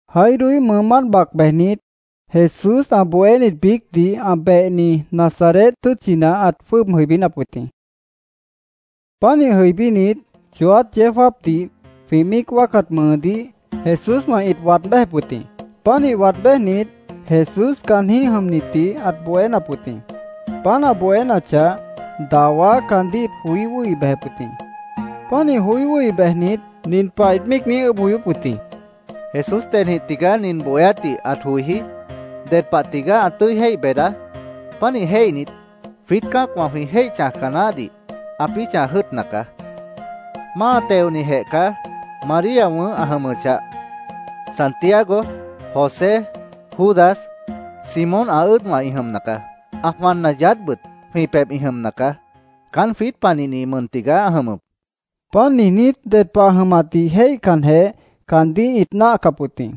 Jairoíh mʉʉmánt bac bejnit, Jesús ã bohénit biícdih ã behni Nazaret tʉ́tchina ãt jwʉ́ʉb jʉibínap wʉt jĩ. Pánih jʉibínit, chooát yeó jáapdih jwĩ míic wáacat mʉʉdíh Jesúswã ĩt waad béjep wʉt jĩ. Pánih waad béjnit, Jesús caanjĩ́h jʉmnitdih ãt bohénap wʉt jĩ. Páant ã bohénachah, dawá caandíh ĩt joí wʉ́hi bejep wʉt jĩ. Pánih joí wʉ́hi bejnit, nin pah ĩt míic niíj ʉʉ́bh joyóp wʉt jĩ: —¿Jesús dedjĩh tigaá, nin bohéátdih ãt joijí? ¿Ded pah tigaá ã tʉ́i jéih beedá? Pánih jéihnit, jwiít cã́acwã jwĩ jéih chãjca naáhdih ãpĩ́ chãj jʉ́ʉtna caá. Máa teonijeh caá. María wʉ̃ʉ́h ã jʉmʉchah, Santiago, José, Judas, Simón ã ʉ́ʉdwã ĩ jʉmna caá. Ã jwanna yaádhbʉt jwĩ pebh ĩ jʉmna caá. Caán jwiít panihni mʉn tigaá ã jʉmʉp, ĩt míic niijíp wʉt jĩ. Páant niijnít, ded pah ã jʉmatdih jéihcanjeh, caandíh ĩt náahcap wʉt jĩ.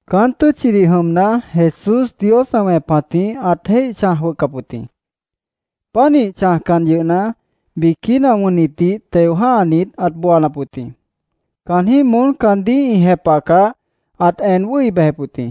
Caán tʉ́tchidih jʉmna, Jesús Dios ã wẽpatjĩh ãt jéih chãj jʉ́ʉtcap wʉt jĩ. Pánih chãjcan yʉhna, biquína wʉnnitdih teo jã́hanit ãt booanap wʉt jĩ. Caanjĩ́h moón caandíh ĩ jepahcah, ãt en wʉ́hi bejep wʉt jĩ.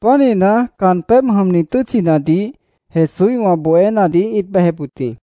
Pánihna, caan pébh jʉmni tʉ́tchinadih Jesúswã bohénadih ĩt bejep wʉt jĩ.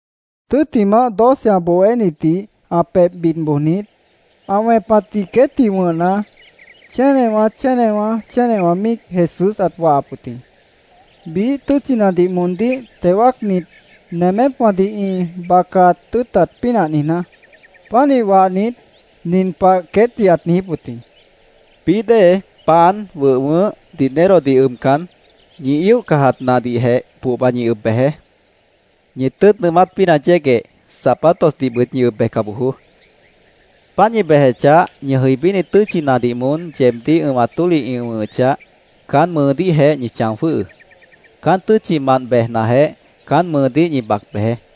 Tʉ́ttimah, doce ã bohénitdih ã pebh bid bojnit, ã wẽpatdih queétdih wʉ̃hna, chénewã, chénewã, chénewã míic Jesús ãt wahap wʉt jĩ, biíh tʉ́tchinadih moondíh teo wáacnit, nemépwãdih ĩ bacat tʉ́ʉtat pínah niijná. Pánih wahnit, nin pah queétdih ãt niijíp wʉt jĩ: —Bií dée, pan, wʉh wʉʉ́h, dinerodih ʉbcan, ñi íoh cajat nahdihjeh pohba ñi ʉb bejeé. Ñi tʉ́ʉt nʉʉmát pínah yégueh, zapatosdihbʉt ñi ʉb bejca bojoó. Páant ñi bejechah, ñi jʉibíni tʉ́tchinadih moón yeebdíh ʉ̃wat tólih ĩ wʉ̃hʉchah, caán mʉʉdíhjeh ñi chão jwʉ́hʉʉ́. Caán tʉ́tchimant bejnajeh, caán mʉʉdíh ñi cádah bejeé.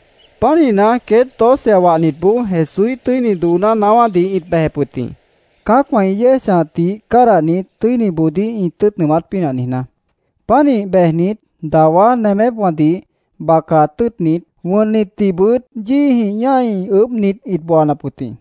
Pánihna, queét doce ã wahnitboó Jesúíh tʉ́ini dooná naáwádih ĩt bejep wʉt jĩ, cã́acwã ĩ yéej chãjatdih cádahnit, tʉ́iniboodíh ĩ tʉ́ʉt nʉʉmát pínah niijná. Pánih bejnit, dawá nemépwãdih bacat tʉ́ʉtnit, wʉnnitdihbʉt yíijĩh ñái, ʉʉ́bhnit, ĩt booanap wʉt jĩ.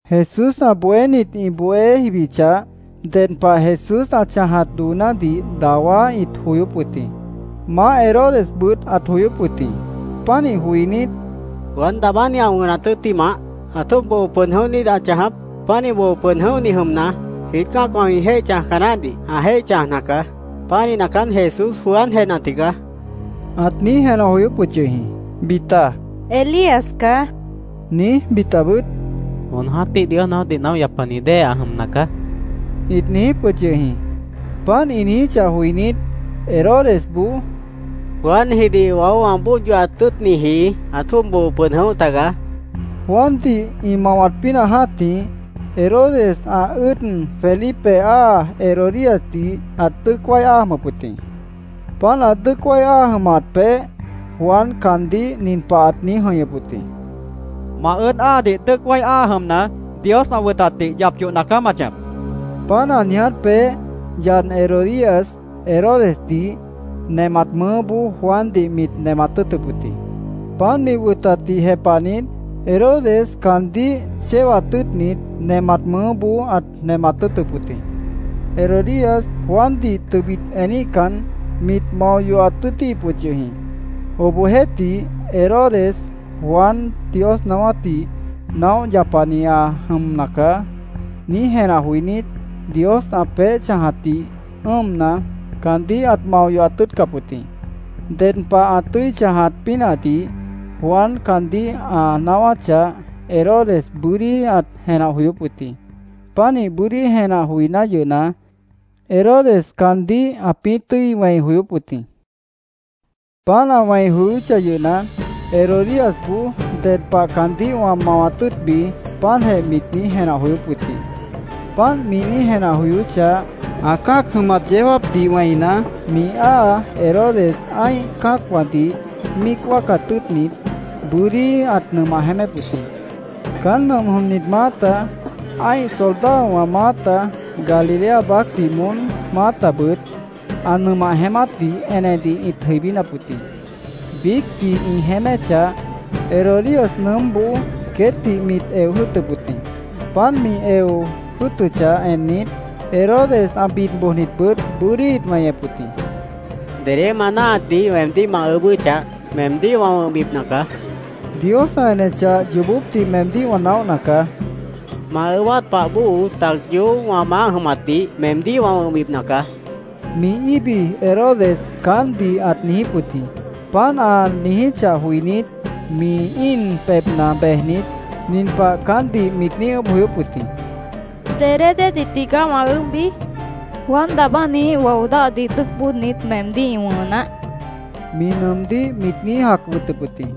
Jesús ã bohénit ĩ bohé jibichah, ded pah Jesús ã chãjat doonádih dawá ĩt joyóp wʉt jĩ. Maáh Herodesbʉt ãt joyóp wʉt jĩ. Pánih joinít, “¿Juan Daabáni ã wʉnat tʉ́ttimah, ãt jwʉ́ʉb boo pʉd jʉ̃óh niít ãt chãjap? Pánih boo pʉd jʉ̃óhni jʉmna, jwiít cã́acwã jwĩ jéih chãjca naáhdih ã jéih chãjna caá. Pánihna, caán Jesús Juanjehna tigaá”, ãt niíj jenah joyóp wʉt yʉh jĩ. Bita “Elías caá”, niíj, bitabʉt “Jon jã́tih Dios naáwátdih naóh yapani dée ã jʉmna caá”, ĩt niijíp wʉt yʉh jĩ. Páant ĩ niijíchah joinít, Herodesboó —Juanjidih waó wã bóod yohat tʉ́ʉtniji ãt jwʉ́ʉb boo pʉd jʉ̃óh tagaá, ãt niijíp wʉt jĩ. Juandih ĩ mawat pínah jã́tih, Herodes ã ʉ́ʉd Felipe áa Herodíasdih ãt dʉ́ʉc wái áa jʉmʉp wʉt jĩ. Páant ã dʉ́ʉc wái áa jʉmat peéh Juan caandíh nin pah ãt niíj jʉ̃ihñʉp wʉt jĩ: “Ma ʉ́ʉd áadih dʉ́ʉc wái áa jʉmna, Dios ã wʉtatdih yap yohna caá ma chãjap”, ãt niijíp wʉt jĩ. Páant ã niiját peéh yad Herodías Herodesdih nemat mʉʉ́boó Juandih mit nemat tʉ́ʉtʉp wʉt jĩ. Páant mi wʉtatdih jepahnit, Herodes caandíh chéwat tʉ́ʉtnit, nemat mʉʉ́boó ãt nemat tʉ́ʉtʉp wʉt jĩ. Herodías Juandih tʉbit eníhcan, mit mao yohat tʉ́ʉtíhip wʉt yʉh jĩ. Obohjeéhtih, Herodes “Juan Dios naáwátdih naóh yapani ã jʉmna caá”, niíj jenah joinít, Dios ã peéh chãjatdih ʉ́ʉmna, caandíh ãt mao yohat tʉ́ʉtcap wʉt jĩ. Ded pah ã tʉ́i chãjat pínahdih Juan caandíh ã naáwáchah, Herodes bʉ́dí ãt jenah joyóp wʉt jĩ. Pánih bʉ́dí jenah joiná yʉhna, Herodes caandíh ãpĩ́ tʉ́i wẽi joyóp wʉt jĩ. Páant ã wẽi joyóchah yʉhna, Herodíasboó “Ded pah caandíh wã mawat tʉ́ʉtbi”, páantjeh mit niíj jenah joyóp wʉt jĩ. Páant mi niíj jenah joyóchah, ã cã́ac jʉmat yeó jáapdih wẽina, mi áa Herodes ã́ih cã́acwãdih míic wáacat tʉ́ʉtnit, bʉ́dí ãt nʉmah jeémép wʉt jĩ. Caán nʉmp jʉmnit maáta, ã́ih soldadowã maáta, Galilea baácdih moón maátabʉt, ã nʉmah jeémátdih enedih ĩt jʉibínap wʉt jĩ. Biícdih ĩ jeéméchah, Herodías nʉʉ́mboó queétdih mit eo jʉ́ʉtʉp wʉt jĩ. Páant mi eo jʉ́ʉtʉchah ennit, Herodes, ã bid bojnitbʉt, bʉ́dí ĩt weñep wʉt jĩ. —Dedé ma náahatdih weemdíh ma ʉʉ́bʉ́chah, meemdíh wã wʉ̃hbipna caá. Dios ã enechah, yoobópdih meemdíh wã naóhna caá. Ma ʉʉ́bát pah bóo tac yoób wã maáh jʉmatdih meemdíh wã wʉ̃hbipna caá, mi íbi Herodes caántdih ãt niijíp wʉt jĩ. Páant ã niijíchah joinít, mi íin pebhna bejnit, nin pah caántdih mit niíj ʉʉ́bh joyóp wʉt jĩ: —¿Dedé déedih tigaá wã ʉʉ́bhbi? mit niijíp wʉt jĩ. —Juan Daabániíh wao dáhdih dʉ́ʉc bóodnit, meemdíh ĩ wʉ̃hʉ naáh, mi nʉʉmdíh mit niíj jac wʉtʉp wʉt jĩ.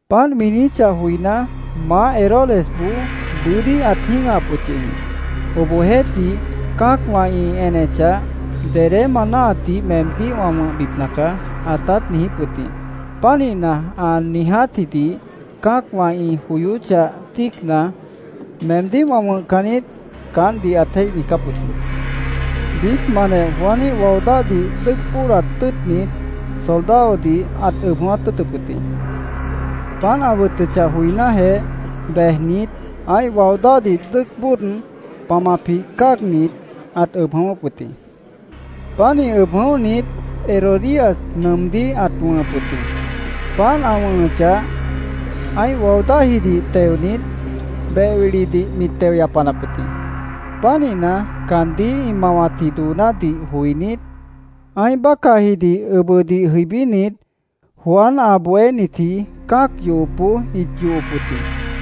Páant mi niijíchah joiná, maáh Herodesboó bʉ́dí ãt jĩ́gahap wʉt yʉh jĩ. Obohjeéhtih, cã́acwã ĩ enechah, “Dedé ma náahatdih meemdíh wã wʉ̃hbipna caá”, ãtát niijíp wʉt jĩ. Pánihna, ã niijátjidih cã́acwã ĩ joyóchah, tíicna, “Meemdíh wã wʉ̃hcan niít”, caántdih ãt jéih niijcáp wʉt jĩ. Biícmantjeh Juaníh wao dáhdih dʉ́ʉc bóodat tʉ́ʉtnit, soldadodih ãt ʉb jʉ̃ʉ́wát tʉ́ʉtʉp wʉt jĩ. Páant ã wʉtʉchah joinájeh, bejnit, ã́ih wao dáhdih dʉ́ʉc bóod, pamapjih cáagnit, ãt ʉb jʉ̃ʉ́wʉ́p wʉt jĩ. Pánih ʉb jʉ̃óhnit, Herodías nʉʉmdíh ãt wʉ̃hʉp wʉt jĩ. Páant ã wʉ̃hʉchah, ã́ih wao dáhjidih teonit, beh wilidih mit teo yapanap wʉt jĩ. Pánihna, caandíh ĩ mawatji doonádih joinít, ã́ih bácahjidih ʉbʉdih jʉibínit, Juan ã bohénitji cã́ac yohopboó ĩt yohop wʉt jĩ.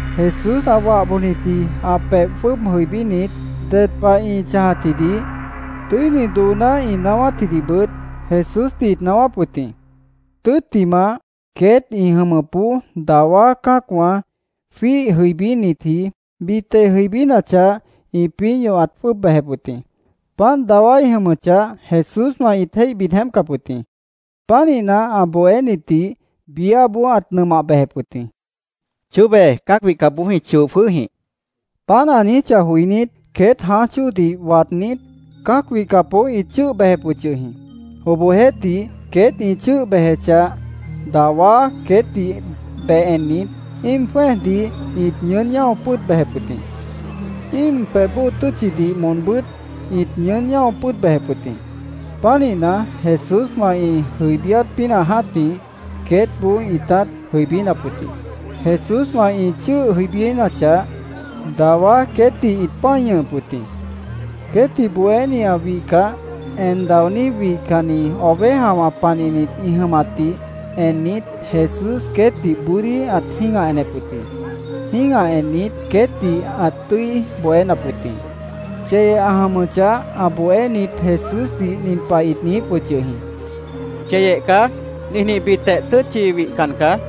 Jesús ã wah bojnitji ã pebh jwʉ́ʉb jʉibínit, ded pah ĩ chãjatjidih, tʉ́ini dooná ĩ naáwátjidihbʉt Jesúsdih ĩt naáwáp wʉt jĩ. Tʉ́ttimah, queét ĩ jʉmʉpboó dawá cã́acwã jwíih jʉibínitji bita ĩ jʉibínachah, ĩpĩ́ ñahwat jwʉ́ʉb bejep wʉt jĩ. Páant dawá ĩ jʉmʉchah, Jesúswã ĩt jéih bid jeémpcap wʉt jĩ. Pánihna, ã bohénitdih biáboó ãt nʉmah bejep wʉt jĩ. —Chóbe cã́ac wihcapboó jwĩ choo jwʉ́hjĩh, queétdih ãt niijíp wʉt jĩ. Páant ã niijíchah joinít, queét jãáj chóodih waadnít, cã́ac wihcapboó ĩt chʉ́ʉh bejep wʉt yʉh jĩ. Obohjeéhtih, queét ĩ chʉ́ʉh bejechah, dawá queétdih beh ennit, íim jwẽ́ejdih ĩt ñʉʉ́n ñáo pʉ́ʉd bejep wʉt jĩ. Íim pebh bóo tʉ́tchidih moonbʉ́t ĩt ñʉʉ́n ñáo pʉ́ʉd bejep wʉt jĩ. Pánihna, Jesúswã ĩ jʉibíát pínah jã́tih queétboó ĩtát jʉibínap wʉt jĩ. Jesúswã ĩ chʉ́ʉh jʉibínachah, dawá queétdih ĩt pã́i ñʉhʉp wʉt jĩ. Queétdih bohéni ã wihcah, en daoní wihcanni ovejawã panihnit ĩ jʉmatdih ennit, Jesús queétdih bʉ́dí ãt jĩ́gah enep wʉt jĩ. Jĩ́gah ennit, queétdih ãt tʉ́i bohénap wʉt jĩ. Cheyeh ã jʉmʉchah, ã bohénit Jesúsdih nin pah ĩt niijíp wʉt yʉh jĩ: —Cheyeh caá. Ninjĩhbitjeh tʉ́tchi wihcan caá.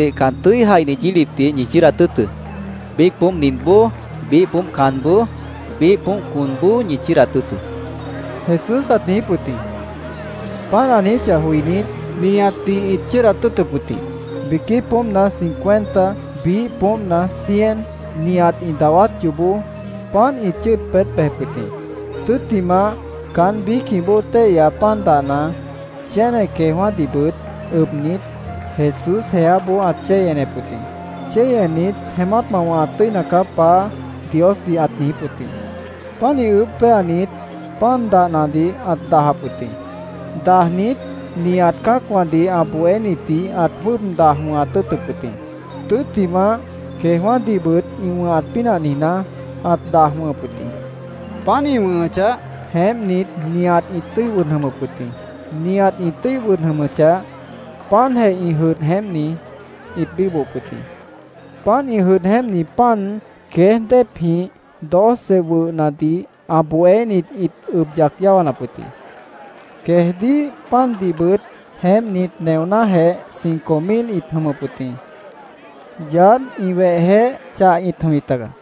—Cã́acwãdih can tʉ́i jaihni yílipdih ñi chʉ́ʉdat tʉ́ʉtʉ́. Biíc poómp ninboó, biíh poómp canboó, biíh poómp conboó, ñi chʉ́ʉdat tʉ́ʉtʉ́, Jesús ãt niijíp wʉt jĩ. Páant ã niijíchah joinít, nihatdih ĩt chʉ́ʉdat tʉ́ʉtʉp wʉt jĩ. Biquí poómpna cincuenta, biíh poómpna cien, nihat ĩ dawát yoobó páant ĩt chʉ́ʉd peetép wʉt jĩ. Tʉ́ttimah, caán biícjĩh bóo téihya pan dahna, chéne queejwã́dihbʉt ʉbnit, Jesús jeáboó ãt chéi enep wʉt jĩ. Chéi ennit, “Jeémát ma wʉ̃hat tʉ́ina caá, Paá”, Diosdih ãt niijíp wʉt jĩ. Pánih ʉʉ́bh péanit, pan dahnadih ãt dajap wʉt jĩ. Dajnit, nihat cã́acwãdih ã bohénitdih ãt jwʉ́ʉb daj wʉ̃hat tʉ́ʉtʉp wʉt jĩ. Tʉ́ttimah, queejwã́dihbʉt ĩ wʉ̃hat pínah niijná, ãt daj wʉ̃hʉp wʉt jĩ. Páant ĩ wʉ̃hʉchah, jeémpnit, nihat ĩt tʉ́i wʉd jʉmʉp wʉt jĩ. Nihat ĩ tʉ́i wʉd jʉmʉchah, páantjeh ĩ jʉdh jeémpni ĩt bíbohop wʉt jĩ. Páant ĩ jʉdh jeémpni pan, queéj déepjĩh doce wʉhnadih ã bohénit ĩt ʉb yac yáwanap wʉt jĩ. Queejdíh pandihbʉt jeémpnit neonájeh cinco mil ĩt jʉmʉp wʉt jĩ. Yaádh, ĩ wehjeéh chah ĩt jʉmjip tagaá.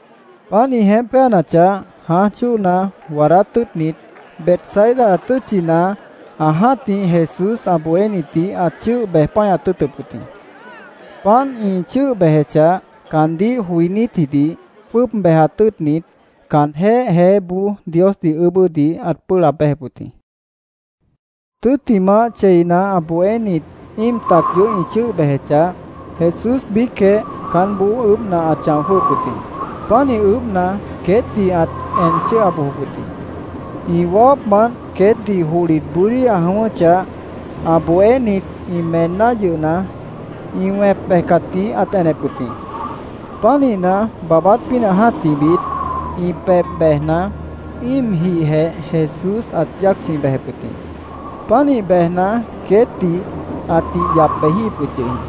Páant ĩ jeémp péanachah, jãáj chóona waadát tʉ́ʉtnit, Betsaida tʉ́tchina ã jã́tih Jesús ã bohénitdih ãt chʉ́ʉh bej páñat tʉ́ʉtʉp wʉt jĩ. Páant ĩ chʉ́ʉh bejechah, caandíh joinítjidih jwʉ́ʉb bejat tʉ́ʉtnit, caanjéh jeéboó Diosdih ʉʉ́bʉ́dih ãt pʉ́ʉh laab béjep wʉt jĩ. Tʉ́ttimah, cheina ã bohénit íim tac yoób ĩ chʉ́ʉh bejechah, Jesús biícjeh caánboó ʉʉ́bhna, ãt chão jwʉ́hʉp wʉt jĩ. Pánih ʉʉ́bhna, queétdih ãt en chʉ́ʉha bojop wʉt jĩ. Ĩ wawápmant queétdih johlit bʉ́dí ã jʉ̃ʉ́wʉ́chah, ã bohénit ĩ meenná yʉhna, ĩ wẽp bejcatdih ãt enep wʉt jĩ. Pánihna, baabát pínah jã́tihbit, ĩ pebh bejna, íimjihjeh Jesús ãt yáac chʉ̃i bejep wʉt jĩ. Pánih bejna, queétdih ãtih yap bejíhip wʉt yʉh jĩ.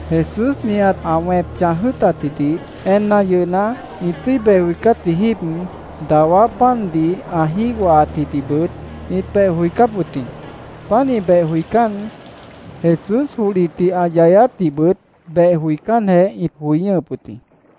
Jesús nihat ã wẽp chãj jʉ́ʉtatjidih enna yʉhna, ĩ tʉ́i beh joicátji jíib, dawá pandih ã jígohaatjidihbʉt ĩt beh joicáp wʉt jĩ. Pánih beh joicán, Jesús johlitdih ã yayáátdihbʉt beh joicánjeh, ĩt joi ñʉ́hʉp wʉt jĩ.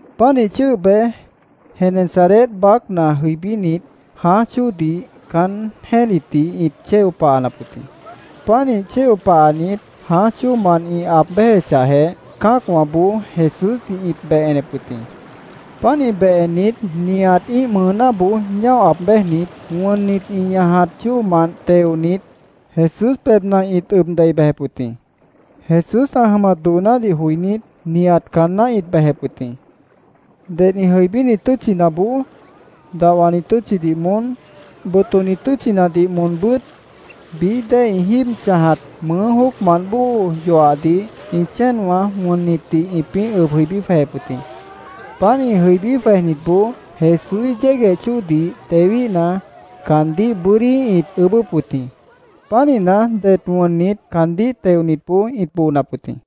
Pánih chʉ́ʉh bej, Genesaret baácna jʉibínit, jãáj chóodih caán jẽ́litdih ĩt chéo pahanap wʉt jĩ. Pánih chéo pahanit, jãáj chóomant ĩ aab béjechahjeh, cã́acwãboó Jesúsdih ĩt beh enep wʉt jĩ. Pánih beh ennit, nihat ĩ́ih mʉʉnáboó ñáo aab béjnit, wʉnnit ĩ ñajat chóomant teonit, Jesús pebhna ĩt ʉb dei bejep wʉt jĩ. Jesús ã jʉmat doonádih joinít, nihat caanná ĩt bejep wʉt jĩ. Ded ĩ jʉibíni tʉ́tchinaboó, dahwani tʉ́tchidih moón, botoni tʉ́tchinadih moonbʉ́t, bií dée ĩ jíib chãjat mʉʉ́ jóocmant bóo yoahdih ĩ chéenwã wʉnnitdih ĩpĩ́ ʉb jʉibí jwejep wʉt jĩ. Páant ĩ jʉibí jwejnitboó Jesúíh yégueh chóodih tewíhna, caandíh bʉ́dí ĩt ʉʉ́bʉ́p wʉt jĩ. Pánihna, det wʉnnit caandíh teonitboó ĩt boonap wʉt jĩ.